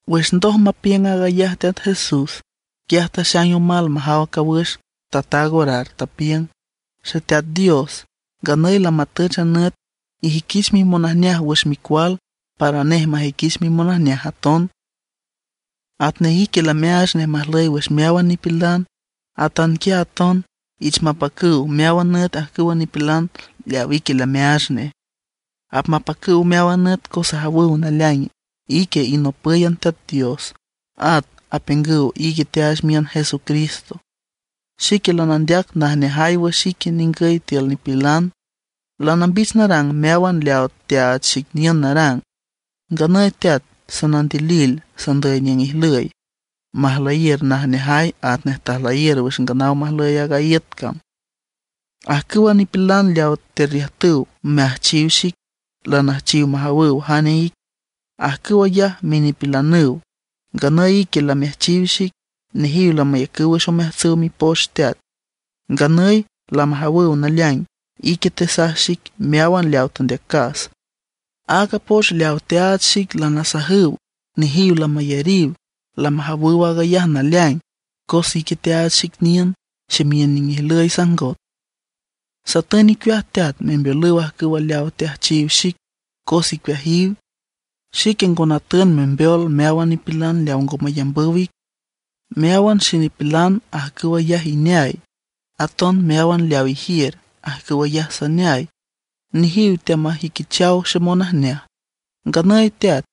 Wüx ndoj mapiüng aag ayaj Teat Jesús, quiaj taxaing omal majaw cawüx, tataag orar, tapiüng: ―Xeteat Dios, nganüy lamatüch a nüt, ijüiquich mimonajneaj wüx Micual, para nej majüiquich mimonajneaj aton. Atnej ique lameaach nej majlüy wüx meáwan nipilan, atanquiaj aton iich mapacüw meáwan nüt ajcüwa nipilan leawa ique lameaach nej. Apmapacüw meáwan nüt cos ajawüw naleaing ique inopǘyan Teat Dios, at apiüngüw ique teaach miün Jesucristo. ’Xique lanandeac najneajay wüx ique ningüy tiül nipilan. Lanambich narang meáwan leawa teaach xic niün narang. Nganüy Teat, sanandilil sandüy niüng ijlüy, majlüyiür najneajay atnej tajlüyiür wüx nganaw majlüy aaga iüt cam. ’Ajcüwa nipilan leawa terriüjtüw meajchiw xic, lanüjchiw majawüw jane ic. Ajcüw ayaj minipilanüw, nganüy ique lameajchiw xic. Nejiw lamayacüw wüx omeajtsüw Mipoch, Teat. Nganüy lamajawüw naleaing ique tesaj xic meáwan leawa tandeacas. Aaga poch leawa teaach xic lanasajüw, nejiw lamayariw. Lamajawüw aag ayaj naleaing cos ique teaach xic niün, ximiün niüng ijlüy sajngot. ’Satün icueaj Teat, membeolüw ajcüwa leaw teajchiw xic, cos icueajiw. Xique ngo natün membeol meáwan nipilan leaw ngo mayamb ic. Meáwan xenipilan ajcüw ayaj ineay; aton meáwan leaw ijiür, ajcüw ayaj saneay. Nejiw teamajüiquichaw xemonajneaj. ’Nganüy Teat,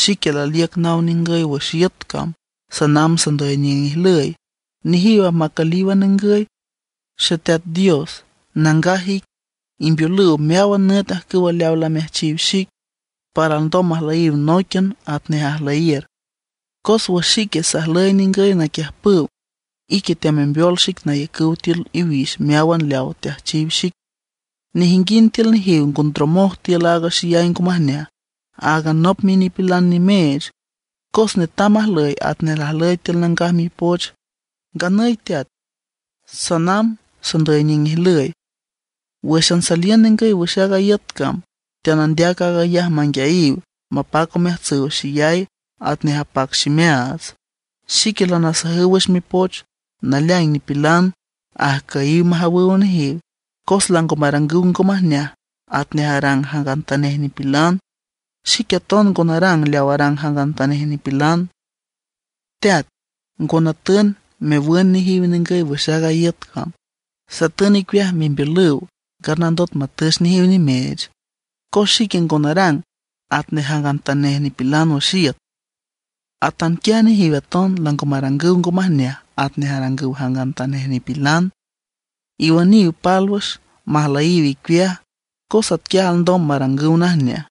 xique laliüc naw ningüy wüx iüt cam, sanamb sandüy niüng ijlüy; nejiw apmacülíwan ningüy. Xeteat Dios, nangaj ic, imbeolüw meáwan nüt ajcüwa leaw lameajchiw xic, para alndom majlüyiw nóiquian atnej ajlüyiür. Cos wüx xique sajlüy ningüy naquiüjpüw, ique teamembeol xic nayacüw tiül iwix meáwan leawa teajchiw xic. Nejinguind tiül nejiw ngo ndromoj tiül aaga xeyay ngo majneaj, áagan anop minipilan nimeech; cos netam majlüy atnej lajlüy tiül Nangaj Mipoch. ’Nganüy Teat, sanamb sandüy niüng ijlüy. Wǘxan saliün ningüy wüx aaga iüt cam, teanandeac aag ayaj manguiayiw, mapac omeajtsüw xeyay atnej apac ximeaats. Xique lanasajüw wüx mipoch. Naleaing nipilan ajcüyiw majawüw nejiw, cos lango marangüw ngo majneaj atnej arang jangantanej nipilan, Xique aton ngo narang leaw arang jangantanej nipilan. Teat, ngo natün mewün nejiw ningüy wüx aaga iüt cam; satün icueaj membeolüw nganandot matüch nejiw nimeech. Cos xique ngo narang atnej jangantanej nipilan wüx iüt, atanquiaj nejiw aton lango marangüw ngo majneaj atnej arangüw jangantanej nipilan. Iwüniw pálwüx, majlüyiw icueaj, cos atquiaj alndom marangüw najneaj.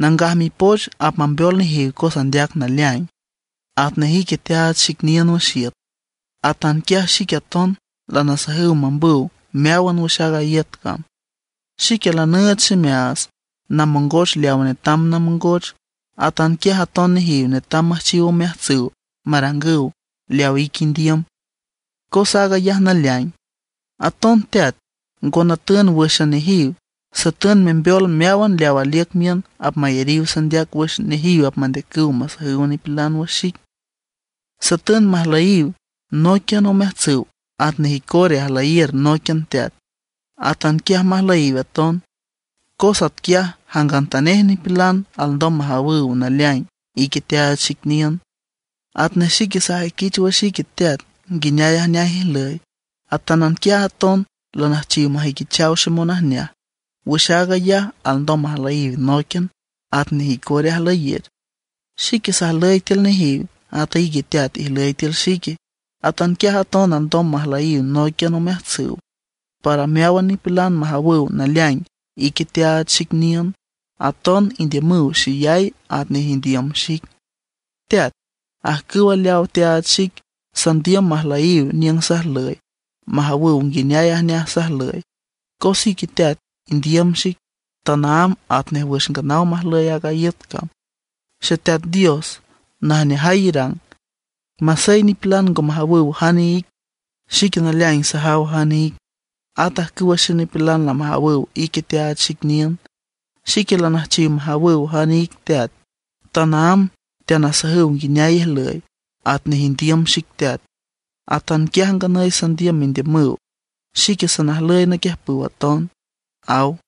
Nangaj Mipoch apmambeol nejiw cos andeac naleaing. Atnej ique teaach xic niün wüx iüt, atanquiaj xique aton lanasajüw mambüw meáwan wüx aaga iüt cam. Xique lanüüch ximeaats namongoch leaw netam namongoch. Atanquiaj aton nejiw netam müjchiw omeajtsüw marangüw leaw ique indiüm, cos aag ayaj naleaing. ’Aton Teat, ngo natün wǘxan nejiw; satün membeol meáwan leaw aliüc miün apmayariw sandeac wüx nejiw apmandeacüw masajüw nipilan wüx xic. Satün majlüyiw nóiquian omeajtsüw atnej icora ajlüyiür nóiquian Teat, atanquiaj majlüyiw aton; cos atquiaj jangantanej nipilan alndom majawüw naleaing ique teaach xic niün. Atnej xique sajüiquich wüx ique Teat, nguineay ajneaj ijlüy, atanquiaj aton lanüjchiw majüiquichaw xemonajneaj. Wüx aag ayaj alndom majlüyiw nóiquian atnej icora ajlüyiür. Xique sajlüy tiül nejiw, ata ique Teat, ijlüy tiül xique. Atanquiaj aton alndom majlüyiw nóiquian omeajtsüw, para meáwan nipilan majawüw naleaing ique teaach xic niün. Aton indiümüw xeyay atnej indiüm xic. ’Teat, ajcüwa leawa teaach xic, sandiüm majlüyiw niüng sajlüy, majawüw nguineay ajneaj sajlüy. Cos ique Teat, indiüm xic tanaámb atnej wüx nganaw majlüy aaga iüt cam. Xeteat Dios, najneajay irang. Masey nipilan ngo majawüw jane ic, xique naleaing sajaw jane ic. At ajcüwa xenipilan lamajawüw ique teaach xic niün. Xique lanüjchiw majawüw jane ic Teat; tanaámb teanasajüw nguineay ijlüy. Atnej indiüm xic Teat, atanquiaj nganüy sandiüm mendiümüw. Xique sanajlüy naquiüjpüw aton ―aw.